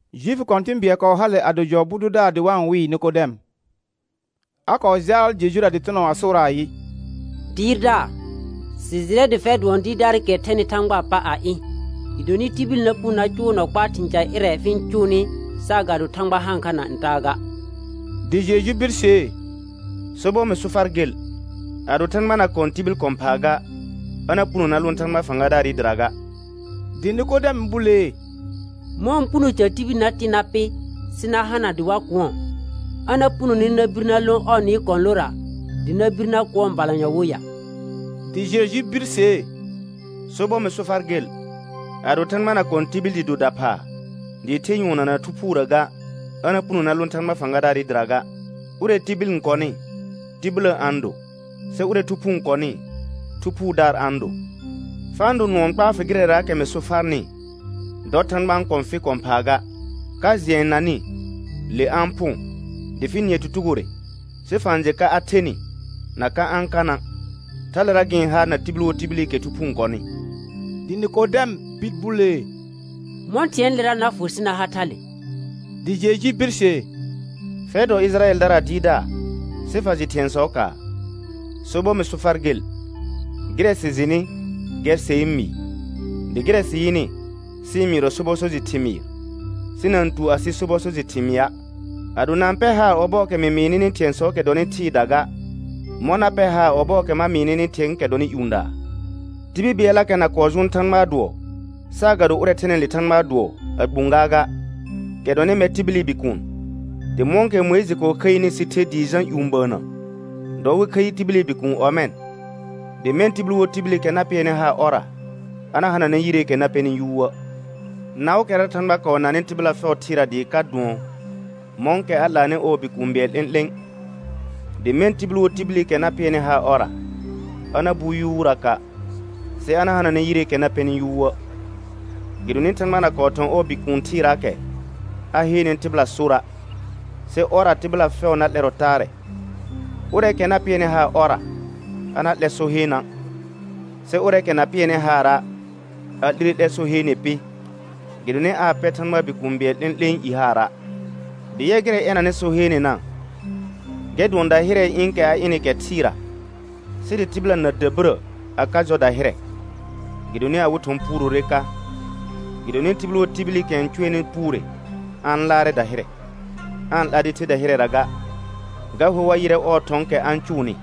Juifi kɔ̃tɩ̃ bɩɛl kɔɔ hale a do.lɔfu bʋ dʋdaar dɩ wa-n wɩɩ Nɩkɔdɛm. A kɔɔ jaal Jejura dɩtɩnɔ a sʋʋraa ayɩ: Dɩɩrdaar, sɩ jɩrɛ dɩ fɛr dʋɔn dɩɩrdaarɩkɛ thɛnɩ Thãgbaa pa a ɩ̃, gɩdonɩ tibil na puno na cʋʋ nɔ kpaa thɩ̃ ca ƴɩrɛ fɩ-n cʋʋnɩ saagado Thãgba haan kha na ntaa ga. Dɩ Jeju birsee: Sobɔr mɩ so far gel, ado Thãgba na kɔ̃ tibil kɔ̃ phaa ga, a na puno na lõ Thãgba fãgadaarɩ dɩra ga. Dɩ Nɩkɔdɛm bulee: Mɔ̃ɔ puno ca tibil na tɩ̃ na pɩ, sɩ na hana dɩ wa kʋ̃ɔ? A na punone na bir na lõ ɔɔ nɩɩ kɔ̃lora, dɩ na bir na kʋ̃ɔ balanyɔ wo ya? Dɩ Jeju birsee: Sobɔr mɩ so far gel, ado Thãgba na kɔ̃ tibil dɩ do daphaa dɩɩ the nyʋɔnna na Thu Phuurə ga, a na puno na lõ Thãgba fãgadaarɩ dɩra ga. Ʋrɛ tibil n kɔnɩ, tibillə a-n do, sɩ ʋrɛ Thu Phuu n kɔnɩ, Thu Phuudaar a-n do. Fa-n do nʋɔ n kpaa fɩ gɩrɛraakɛ mɩ so farnɩ: Dɔ Thãgba n kɔ̃ fɩ kɔ̃ phaa ga. Ka jɩɛ n nanɩ, le a-n phʋ̃ dɩ fɩ nɩɛ tutugore sɩ fa-n jɩ ka a thenɩ na ka a-n kana'. Thalera gɩ-n ha na tibil wo tibilikɛ Thu Phuu n kɔnɩ. Dɩ Nɩkɔdɛm bir bulee: Mɔ̃ thɩ̃ɛɛlera na fʋ sɩ na ha thale? Dɩ Jeju birsee: Fɛr dɔ Ɩjɩrayɛldaraa dɩɩrdaar sɩ fa jɩ thɩ̃ɛsɔɔkaa? Sobɔr mɩ so far gel, gɩrɛ sɩ jɩnɩ gɛr ser n mɩɩ, dɩ gɩrɛ sɩ yɩnɩ sɩ-n mɩɩrɔ sobɔ so jɩ thɩmɩɩr, sɩ na-n tu asɩ sobɔ so jɩ thɩmɩa'. Ado na-n pɛr haar ɔbɔɔkɛ mɩ mɩɩ nɩnɩ thɩ̃ɛɛkɛ dɔnɩ thɩɩda ga, mɔ̃ na pɛr haar ɔbɔɔkɛ ma mɩɩ nɩnɩ thɩ̃ɛɛkɛ dɔnɩ ƴũdaa? Tibil bɩɛllakɛ na kɔɔ jʋʋn Thãgbaa dʋɔ saagado ʋrɛ thɛnɩ le Thãgbaa dʋɔ a gbũ gaaga, kɛ dɔnɩ mɛr tibili Bikuun. Dɩ mɔ̃kɛ Mʋɩjɩ kɔɔ khəini sɩ ther dɩɩ jã ƴũ bəənnə, dɔ wɩ khəi tibili Bikuun ɔmɛ̃, dɩ mɛ̃ tibil wo tibilikɛ na pɩɛrnɩ haar ɔrra, a na hananɛ yireekɛ na pɛnɩ yuuə'. Naʋʋkɛra Thãgba kɔɔ nanɩ tɩbɩla fɛʋ thɩɩra dɩɩ ka dʋɔn mɔ̃kɛ a 'laanɩ ɔɔ Bikũu bɩɛl 'lẽ'lẽ, dɩ mɛ̃ tibil wo tibilikɛ na pɩɛrnɩ haar ɔrra, a na bu yuuraka', sɩ a na hananɛ yireekɛ na pɛnɩ yuuə'. Gɩdonɩ Thãgba na kɔɔ thɔ̃ ɔɔ Bikuun thɩɩraakɛ a heene tɩhɩla sora', sɩ ɔrra tɩbɩla fɛʋ na 'lɛrɔ taarɛ. Ʋrɛɛkɛ na pɩɛrnɩ haar ɔrra, a na 'lɛ so heena', sɩ ʋrɛɛkɛ na pɩɛrnɩ haara', a 'lire 'lɛr so heene pɩ gɩdonɩ aa pɛr Thãgbaa Bikũu bɩɛl 'lẽ'lẽe i haara'. Dɩ yɛ gɩrɛ ɛnanɩ so heenena, gɛr dʋɔn dahɩrɛɛ ɩ̃ɩkɛ a ɩnɩ kɛ thɩɩra sɩ dɩ tɩbɩla na dabirə a ka jɔ dahɩrɛ, gɩdonɩ awɩ thɔ̃ puurore ka. Gɩdonɩ tibil wo tibilikɛ n cʋɛnɩ puure a-n laarɛ dahɩrɛ, aa-n 'la dɩ the dahɩrɛra ga, ga hor wa yɩrɛ ɔɔ thɔ̃ɔkɛ a-n cʋʋnɩ.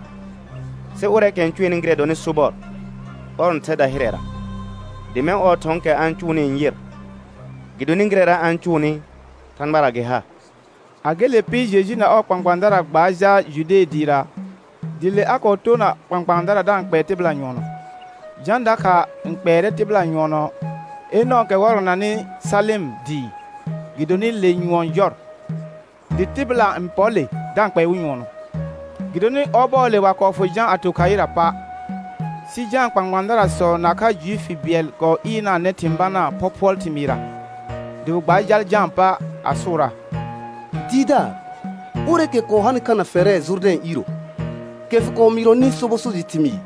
Sɩ ʋrɛɛkɛ n cʋɛnɩ gɩrɛ dɔnɩ sobɔr, ɔr n thɛ dahɩrɛra, dɩ mɛ̃ ɔɔ thɔ̃ɔkɛ a-n cʋʋnɩ n yɩr, gɩdonɩ gɩrɛra a-n cʋʋnɩ Thãgbara gɩ ha. A gele pɩ Jeju na ɔɔ kpãkpãadara gbaar jal Jude dɩɩra, dɩ le a kɔɔ toona kpãkpãadara da-n kpɛɛ tɩbɩla nyʋɔnɔ. Jã dakha n kpɛɛrɛ tɩbɩla nyʋɔnɔ Enɔ̃ɔkɛ wɔrɔnanɩ Salɩm dɩɩ, gɩdonɩ le nyʋɔn jɔr, dɩ tɩbɩla n pɔr le da-n kpɛɛ wɩ nyʋɔnɔ, gɩdonɩ ɔbɔɔle wa kɔɔ fʋ Jã a to khaɩra pa'. Sɩ Jãa kpãkpãadarasɔ nakha Juifi bɩɛl kɔɔ ɩɩrnanɛ thɩ̃ banaa phɔphʋɔl thɩmɩɩrra. Dɩ wɩ gbaar jal Jãa pa a sʋʋraa: Dɩɩrdaar, ʋrɛɛkɛ kɔɔ hanɩ kha na fɛrɛ Jʋrdɛ̃ iiro, kɛ fɩ kɔɔ mɩɩrɔnɩ sobɔ so jɩ thɩmɩɩr,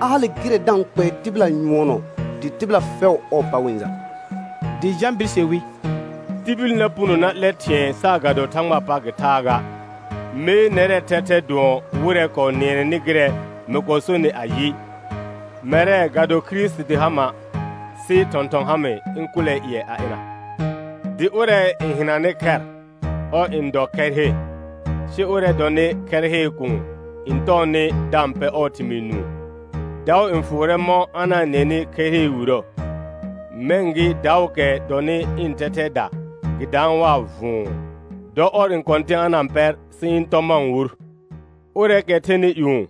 a hale gɩrɛ da-n kpɛɛ tɩbɩla nyʋɔnɔ dɩ tɩbɩla fɛʋ ɔɔ pa wɩ-n jal. Dɩ Jã birse wi: Tibil na puno na 'lɛ thɩ̃ɛ saagado Thãgbaa pa gɩ thaa ga. Mee nɛrɛɛ thɛthɛ dʋɔn wɩrɛ kɔɔ nɩɛnɛnɩ gɩrɛ mɩ kɔɔ sonɩ ayɩ: Mɛrɛ, ga do Kirisiti ha ma', sɩ thɔ̃thɔn ha mɩ ɩ̃ kʋlɛɛ ƴɩɛ a ɩna. Dɩ ʋrɛ n hɩnanɩ khɛr, ɔr n dɔ khɛr he. Sɩ ʋrɛ dɔnɩ khɛr hee kuun n tɔɔnɩ da-n pɛ ɔɔ thɩmɩɩ nũu, daʋ n fʋʋrɛ mɔ̃ a na-n nɩɛnɩ khɛr hee wirə. Mɛ̃ gɩ daʋʋkɛ dɔnɩ ɩ̃ thɛthɛɛda, gɩ daan waa vʋ̃ʋ. Dɔ ɔr n kɔ̃tɩ̃ a na-n pɛr sɩ ɩ̃ tɔ ma-n wur. Ʋrɛɛkɛ thɛnɩ ƴũ,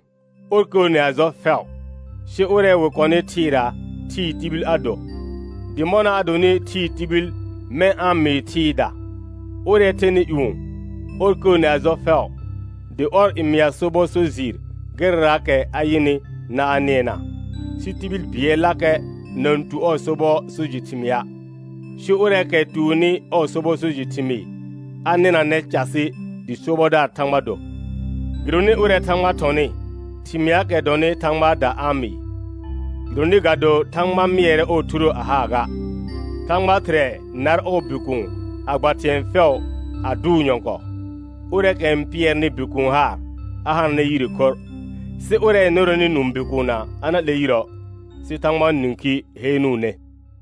ɔr kəəne a jɔ fɛʋ; sɩ ʋrɛ wɩ kɔnɩ thɩɩra, thɩɩ tibil a do, dɩ mɔna a donɩ thɩɩ tibil mɛ̃ a-n mɩɩ thɩɩda. Ʋrɛ thɛnɩ ƴũ, ɔr kəəne a jɔ fɛʋ, dɩ ɔr n mɩa sobɔ so jɩɩr gɩrɛraakɛ a yɩnɩ na a nɩɛna, sɩ tibil bɩɛllakɛ na-n tu ɔɔ sobɔ so jɩ thɩmɩa'. Sɩ ʋrɛɛkɛ tuonni ɔɔ sobɔ so jɩ thɩmɩɩ, a nɩnanɛ casɩ dɩ sobɔdaar Thãgba do. Gɩdonɩ ʋrɛ Thãgba thɔnɩ, thɩmɩaakɛ dɔnɩ Thãgbaada a-n mɩɩ, gɩdonɩ ga do Thãgba mɩɛrɛ ɔɔ Thurə a haa ga. Thãgba Thɩrɛ nar ɔɔ Bikuun a gba thɩ̃ɛ fɛʋ a dʋʋ nyɔ̃kɔɔ. Ʋrɛɛkɛ n pɩɛrnɩ Bikuun haar a hananɛ yire khorr, sɩ ʋrɛ n nʋrɛnɩ nũu Bikuunna a na 'lɛ yirə', sɩ Thãgbaa nĩkhi heenuune.